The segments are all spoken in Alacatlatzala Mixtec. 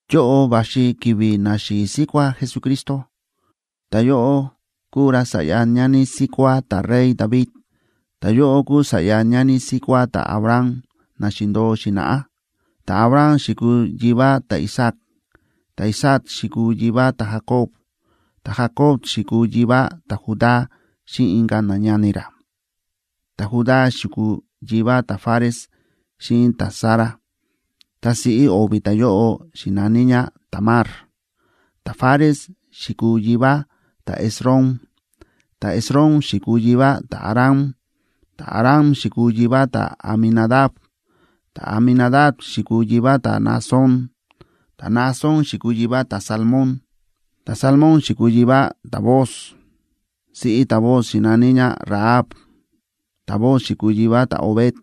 Yóꞌo va̱xi ki̱vi̱ naxi̱i̱ síkuá Jesucristo; ta̱yóꞌo kúu ra sa̱ꞌya ñani síkuá ta̱rey David, ta̱yóꞌo kúu sa̱ꞌya ñani síkuá ta̱Abraham na xi̱ndo̱o xi̱na̱ꞌá. Ta̱Abraham xi̱kuu yivá ta̱Isaac; ta̱Isaac xi̱kuu yivá ta̱Jacob; ta̱Jacob xi̱kuu yivá ta̱Judá xíꞌin inka̱ nañani ra. Ta̱Judá xi̱kuu yivá ta̱Fares xíꞌin ta̱Zara, ta siꞌí o̱vi̱ ta̱yóꞌo xi̱na̱ní ñá Tamar. Ta̱Fares xi̱kuu yivá ta̱Esrom; ta̱Esrom xi̱kuu yivá ta̱Aram. Ta̱Aram xi̱kuu yivá ta̱Aminadab; ta̱Aminadab xi̱kuu yivá ta̱Naasón; ta̱Naasón xi̱kuu yivá ta̱Salmón. Ta̱Salmón xi̱kuu yivá ta̱Booz, siꞌí ta̱Booz xi̱na̱ní ñá Rahab. Ta̱Booz xi̱kuu yivá ta̱Obed,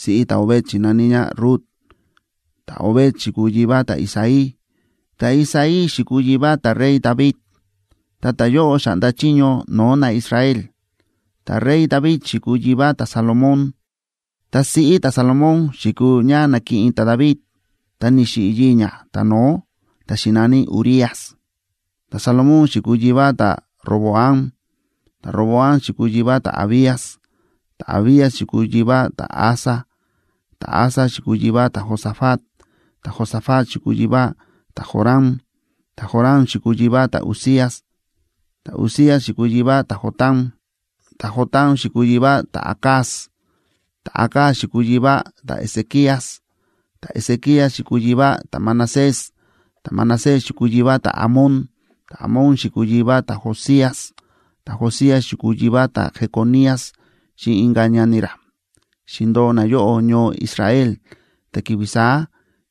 siꞌí ta̱Obed xi̱na̱ní ñá Rut. Ta̱Obed xi̱kuu yivá ta̱Isaí. Ta̱Isaí xi̱kuu yivá ta̱rey David ta ta̱yóꞌo xa̱ꞌnda chiño no̱o̱ naIsrael, ta ta̱rey David xi̱kuu yivá ta̱Salomón. Ta siꞌí ta̱Salomón xi̱kuu ñá na̱kiꞌin ta̱David tá ni̱xiꞌi̱ yii̱ ñá ta̱no̱ó, ta̱ xi̱na̱ní Urías. Ta̱Salomón xi̱kuu yivá ta̱Roboam; ta̱Roboam xi̱kuu yivá ta̱Abías; ta̱Abías xi̱kuu yivá ta̱Asa. Ta̱Asa xi̱kuu yivá ta̱Josafat; ta̱Josafat xi̱kuu yivá ta̱Joram; ta̱Joram xi̱kuu yivá ta̱Uzías. Ta̱Uzías xi̱kuu yivá ta̱Jotam; ta̱Jotam xi̱kuu yivá ta̱Acaz; ta̱Acaz xi̱kuu yivá ta̱Ezequías. Ta̱Ezequías xi̱kuu yivá ta̱Manasés; ta̱Manasés xi̱kuu yivá ta̱Amón; ta̱Amón xi̱kuu yivá ta̱Josías. Ta̱Josías xi̱kuu yivá ta̱Jeconías xíꞌin inka̱ ñani ra. Xi̱ndo̱o nayóꞌo ñoo Israel ta ki̱vi̱ saá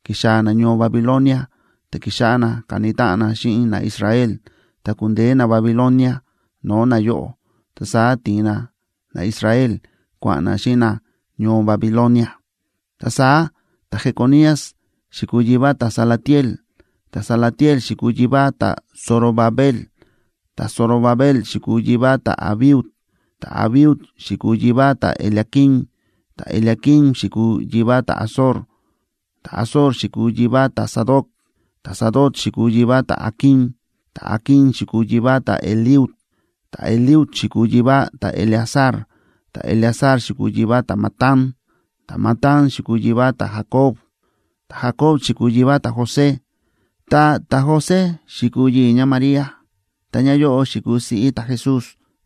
ki̱xaa̱ nañoo Babilonia ta ki̱xáꞌá na káni táꞌan na xíꞌin naIsrael, ta ku̱ndeé naBabilonia no̱o̱ nayóꞌo. Ta saá ti̱in na naIsrael kua̱ꞌa̱n na xíꞌin na ñoo Babilonia. Ta saá ta̱Jeconías xi̱kuu yivá ta̱Salatiel; ta̱Salatiel xi̱kuu yivá ta̱Zorobabel. Ta̱Zorobabel xi̱kuu yivá ta̱Abiud; ta̱Abiud xi̱kuu yivá ta̱Eliaquim; ta̱Eliaquim xi̱kuu yivá ta̱Azor. Ta̱Azor xi̱kuu yivá ta̱Sadoc; ta̱Sadoc xi̱kuu yivá ta̱Aquim; ta̱Aquim xi̱kuu yivá ta̱Eliud. Ta̱Eliud xi̱kuu yivá ta̱Eleazar; ta̱Eleazar xi̱kuu yivá ta̱Matán; ta̱Matán xi̱kuu yivá ta̱Jacob. Ta̱Jacob xi̱kuu yivá ta̱José, ta ta̱José xi̱kuu yii̱ ñáMaría, ta ñáyóꞌo xi̱kuu siꞌí ta̱Jesús,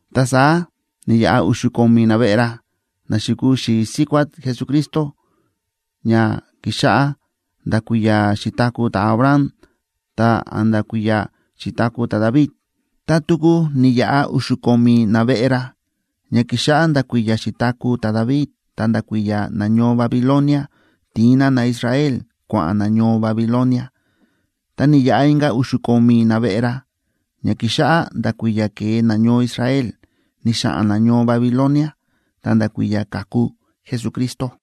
Ta saá ni̱yaꞌa u̱xu̱ ko̱mi̱ naveꞌe ra, na xi̱kuu xi̱i̱ síkuá Jesucristo ña ki̱xáꞌá nda̱ kui̱ya̱ xi̱taku̱ ta̱Abraham ta̱nda̱ kui̱ya̱ xi̱taku̱ ta̱David. Ta tuku ni̱yaꞌa u̱xu̱ ko̱mi̱ naveꞌe ra, ña ki̱xáꞌá nda̱ kui̱ya̱ xi̱taku̱ ta̱David ta̱nda̱ kui̱ya̱ nañoo Babilonia ti̱in na naIsrael kua̱ꞌa̱n na ñoo Babilonia. Ta ni̱yaꞌa inka̱ u̱xu̱ ko̱mi̱ naveꞌe ra, ña ki̱xáꞌá nda̱ kui̱ya̱ ke̱e nañoo Israel ni̱xa̱ꞌa̱n na ñoo Babilonia ta̱nda̱ kui̱ya̱ ka̱ku Jesucristo.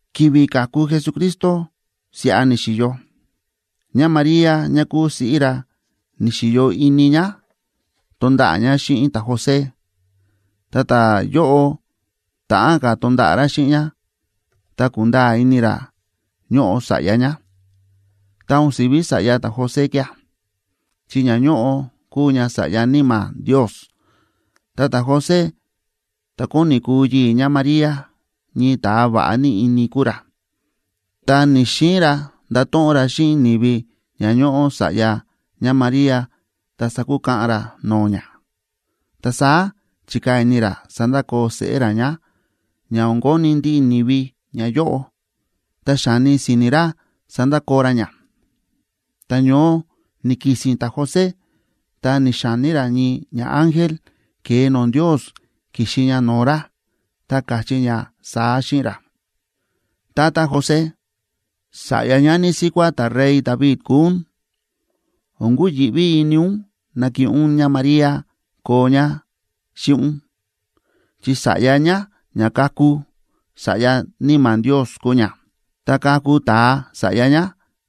Ki̱vi̱ ka̱ku Jesucristo siꞌa ni̱xi̱yo. ÑáMaría ñá kuu siꞌí ra, ni̱xi̱yo ini ñá tonda̱ꞌa̱ ñá xíꞌin ta̱José. Ta ta̱yóꞌo, ta̱ꞌán ka̱ tonda̱ꞌa̱ ra xíꞌin ñá, ta ku̱nda̱a̱ ini ra ñóꞌo sa̱ꞌya ñá, ta o̱n si̱ví sa̱ꞌya ta̱José kía̱, chi ña ñóꞌo kúu ña sa̱ꞌya Níma̱ Ndios. Ta ta̱José, ta̱ kóni kuu yii̱ ñáMaría, ñii ta̱a va̱ꞌa ní ini kúu ra, ta ni̱‑xiin ra ndato̱ꞌon ra xíꞌin ni̱vi ña ñóꞌo sa̱ꞌya ñáMaría ta sakukaꞌan ra no̱o̱ ñá. Ta saá chi̱kaa̱ ini ra sandakoo seꞌé ra ñá, ña o̱n koni ndiꞌi ni̱vi ñayóꞌo. Tá xáni si̱ni̱ ra sandakoo ra ñá, ta ñoó ni̱ki̱si̱n ta̱José ta ni̱xa̱ní ra ñii ñaángel ke̱e no̱o̱ Ndios ki̱xi ña no̱o̱ ra, ta káchí ña saá xíꞌin ra: ―Tata José, sa̱ꞌya ñani síkuá ta̱rey David kúu ún, o̱n kuyi̱ꞌví ini ún nakiꞌin ún ñáMaría koo ñá xíꞌin ún, chi sa̱ꞌya ñá ña kaku, sa̱ꞌya Níma̱ Ndios kúu ña. Tá kaku ta̱a sa̱ꞌya ñá,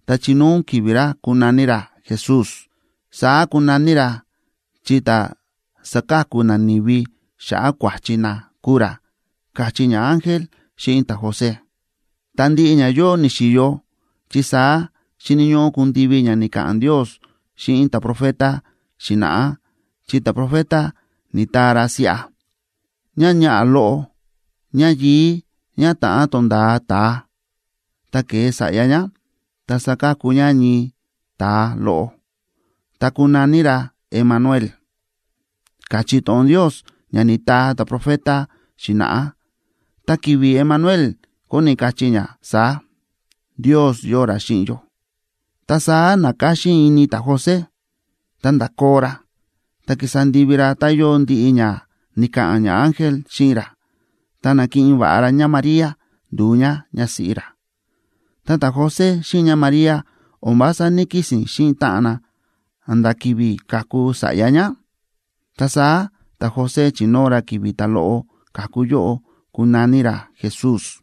ta chinóo ún ki̱vi̱ ra kunaní ra Jesús.b Saá kunaní ra, chi ta̱ saka̱ku nani̱vi xa̱ꞌa̱ kua̱chi na kuu ra ―káchí ñaángel xíꞌin ta̱José. Ta ndiꞌi ñayóꞌo ni̱xi̱yo, chi saá xíni̱ ñóꞌó kundivi ña ni̱ka̱ꞌa̱n Ndios xíꞌin ta̱profetac xi̱na̱ꞌá, chi ta̱profeta ni̱taa ra siꞌa: Ñáñaꞌa̱ loꞌo, ñáyi̱i̱ ñá ta̱ꞌán tonda̱a ta̱a, ta ke̱e sa̱ꞌya ñá, ta sakaku ñá ñii ta̱a loꞌo, ta kunaní ra Emanuel, káchí to̱ꞌon Ndios ña ni̱taa ta̱profeta xi̱na̱ꞌá. Ta ki̱vi̱ “Emanuel” kóni kachí ña saá: Ndios yóo ra xíꞌin yó. Ta saá na̱káxín ini ta̱José, ta nda̱koo ra, ta ki̱sa ndivi ra tá yóo ndiꞌi ña ni̱ka̱ꞌa̱n ñaángel xíꞌin ra, ta na̱kiꞌin va̱ꞌa ra ñáMaría ndu̱u ñá ñásíꞌí ra. Ta ta̱José xíꞌin ñáMaría o̱n vása ní‑kisi̱n xíꞌin táꞌan na a̱nda̱ ki̱vi̱ ka̱ku sa̱ꞌya ñá, ta saá ta̱José chi̱nóo ra ki̱vi̱ ta̱loꞌo ka̱ku yóꞌo kunaní ra Jesús.